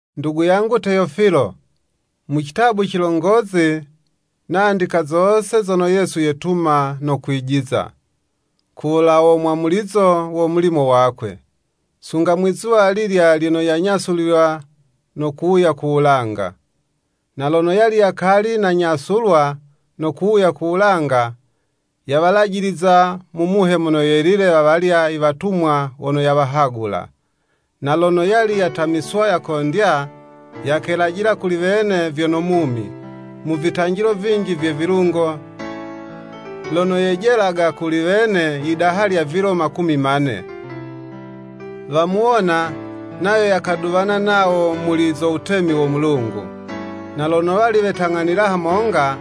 Ndugu yangu Teyofilo, Mu citabu cilongozi nandika zose zono Yesu yetuma no kwijiza, ku wulawo mwamulizo wo mulimo wakwe, sunga mwi'zuwa alilya lyono yanyasulilwa no kuwuya ku wulanga. Na lono yali yakali nanyaswulwa no kuwuya ku wulanga, yawalajiliza mu Muhe Mono Yelile, wawalya iwatumwa wono yawahagula. Na lono, yali yatamiswa yakondya, yakelajila kuli wene vyono mumi, mu vitanjilo vinji vye vilungo, lono yejelaga kuli wene yidaha lya vilo makumi ma'ne. Wamuwona, nayo yakaduwana nawo muli zo wutemi wo Mulungu. Na lono wali wetang'anila hamonga,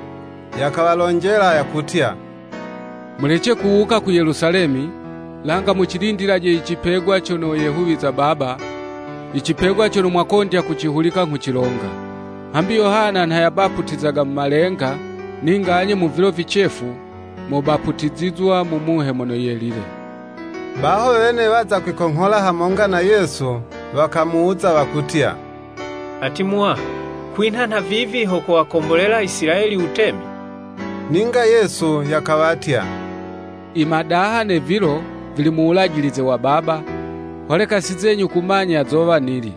yakawalonjela yakutya “Mulece kuwuka ku Yelusalemi, langa mucilindilaje icipegwa cono yehuwiza Baba, icipegwa cono mwakondya kucihulika nghucilonga. Hambi Yohana nha yabaputizaga mu malenga; ninga anye mu vilo vicefu, mobaputizizwa mu Muhe Mono Yelile.” Baho wene, waza kwikonghola hamonga na Yesu, wakamuwuza wakutya, “Ati Muwaha, kwinha nhavivi ho kowakombolela Isilayeli Wutemi?” Ninga Yesu yakawatya, “I madaha ne vilo, vili mu wulajilize wa Baba, holeka si zenyu kumanya zowa nili.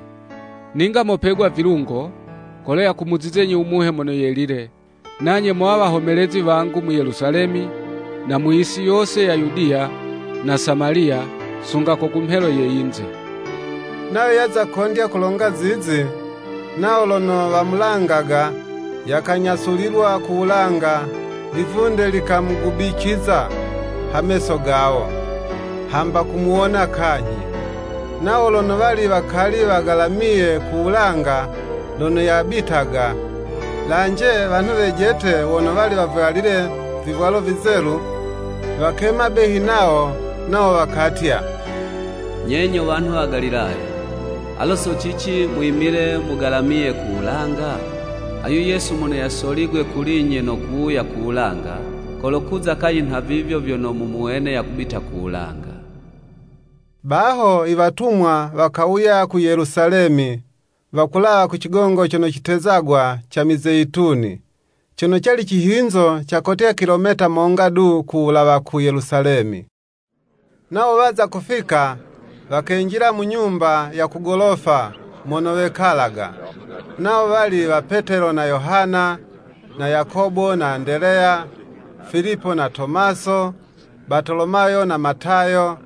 Ninga mopegwa vilungo, kolo yakumuzizenyi u Muhe Mono Yelile, nanye mowa wahomelezi wangu mu Yelusalemi, na mu yisi yose ya Yudiya, na Samaliya, sunga ko ku mhelo ye yinze.” Nayo yaza kondya kulonga zizi; nawo lono wamulangaga, yakanyasulilwa ku wulanga, livunde likamugubiciza ha meso gawo, hamba kumuwona kanyhi. Nawo lono wali wakali wagalamiye ku wulanga lono yabitaga, lanje, wanhu wejete wono wali wavwalile vivwalo vizelu, wakema behi nawo; nawo wakatya, “Nye nyo wanhu wa Galilaya, alo so cici mwimile mugalamiye ku wulanga? Ayu Yesu mono yasoligwe kuli'nye no kuwuya ku wulanga, kolokuza kanyhi nhavivyo vyono mumuwene yakubita ku wulanga.” Baho Iwatumwa wakawuya ku Yelusalemi, wakulawa ku cigongo cono citezagwa ca Mizeyituni, cono cali cihinzo ca kotya kilometa monga du ku wulawa ku Yelusalemi. Nawo waza kufika, wakenjila mu nyumba ya ku golofa, mono wekalaga, nawo wali wa Petelo na Yohana na Yakobo na Andeleya, Filipo na Tomaso, Batolomayo na Matayo,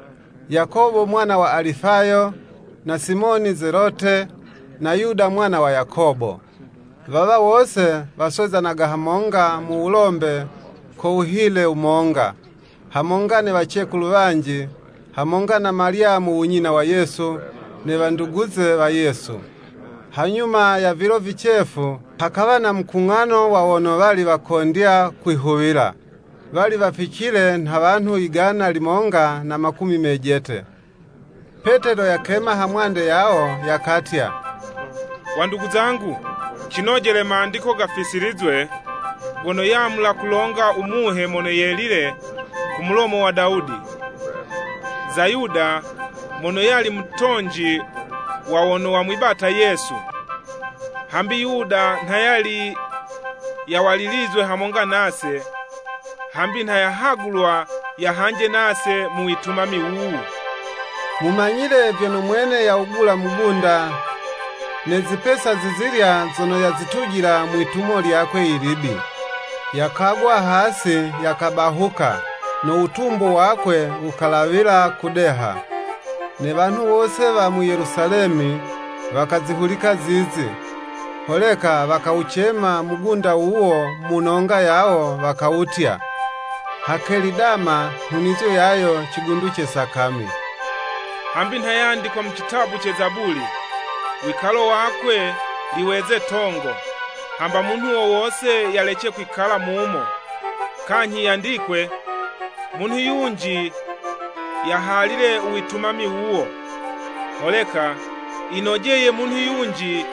Yakobo mwana wa Alifayo, na Simoni zelote, na Yuda mwana wa Yakobo. Wawa wose, waswezanaga hamonga mu wulombe ko wuhile wumonga, hamonga ne wacekulu wanji, hamonga na Malyamu u nyina wa Yesu, ne wanduguze wa Yesu. Hanyuma ya vilo vicefu, hakawa na mukung'ano wa wono wali wakondya kwihuwila, wali waficile nha wanhu yigana limonga na makumi mejete. Petelo yakema hamwande yawo, yakatya, “Wandugu zangu, cinojele mandiko gafisilizwe, gono yamula kulonga u Muhe Mono Yelile ko mulomo wa Dawudi, za Yuda mono yali mutonji wa wono wamwibata Yesu. Hambi Yuda nha yali yawalilizwe hamonga nase, hambi nha yahagulwa yahanje nase mu witumami wuwu.” ( Mumanyile vyono mwene yawugula mugunda, ne zipesa zizilya zono yazitujila mwi'tumo lyakwe ilibi. Yakagwa hasi, yakabahuka, no wutumbu wakwe wukalawila kudeha. Ne wanhu wose wa mu Yelusalemi, wakazihulika zizi, holeka wakawucema mugunda wuwo mu nonga yawo, wakawutya, “Hakeli Dama nhunizo yayo Cigundu ce Sakami.”) “Hambi nha yandikwa mu citabu ce Zabuli: ‘Wikalo wakwe liweze 'tongo, Hamba munhu wo wose yalece kwikala mumo,’ Kanyhi yandikwe, ‘Munhu yunji yahalile u witumami wuwo.’ “Holeka yinojeye munhu yunji,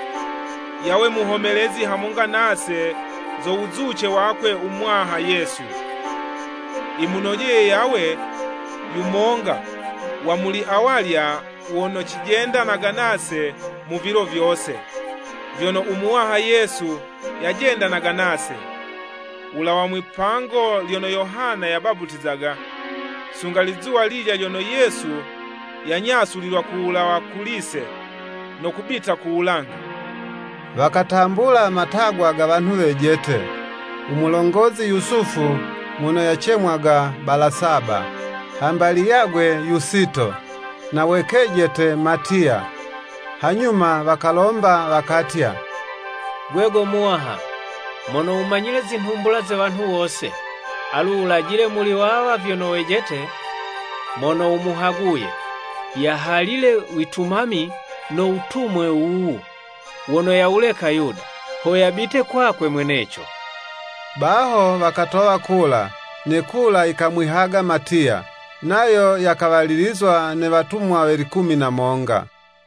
yawe muhomelezi hamonga nase zo wuzuce wakwe u Muwaha Yesu. Yimunojeye yawe yumonga wa muli awalya wono cijendanaga nase mu vilo vyose, vyono u Muwaha Yesu yajendanaga nase, wulawa mwipango lyono Yohana yabaputizaga, sunga lizuwa lilya lyono Yesu yanyasulilwa kuwulawa kuli'se no kubita ku wulanga.” Wakatambula matagwa ga wanhu wejete; u mulongozi Yusufu mono yacemwaga Balasaba (hamba liyagwe Yusito,) na we kejete Matiya. Hanyuma wakalomba wakatya, “Gwe go Muwaha, mono wumanyile zinhumbula ze wanhu wose, alu wulajile muli wawa vyono wejete, mono wumuhaguye, yahalile witumami no wutumwe wuwu, wono yawuleka Yuda, ho yabite kwakwe mweneco.” Baho wakatowa kula, ne kula yikamwihaga Matiya, nayo yakawalilizwa ne watumwa we likumi na monga.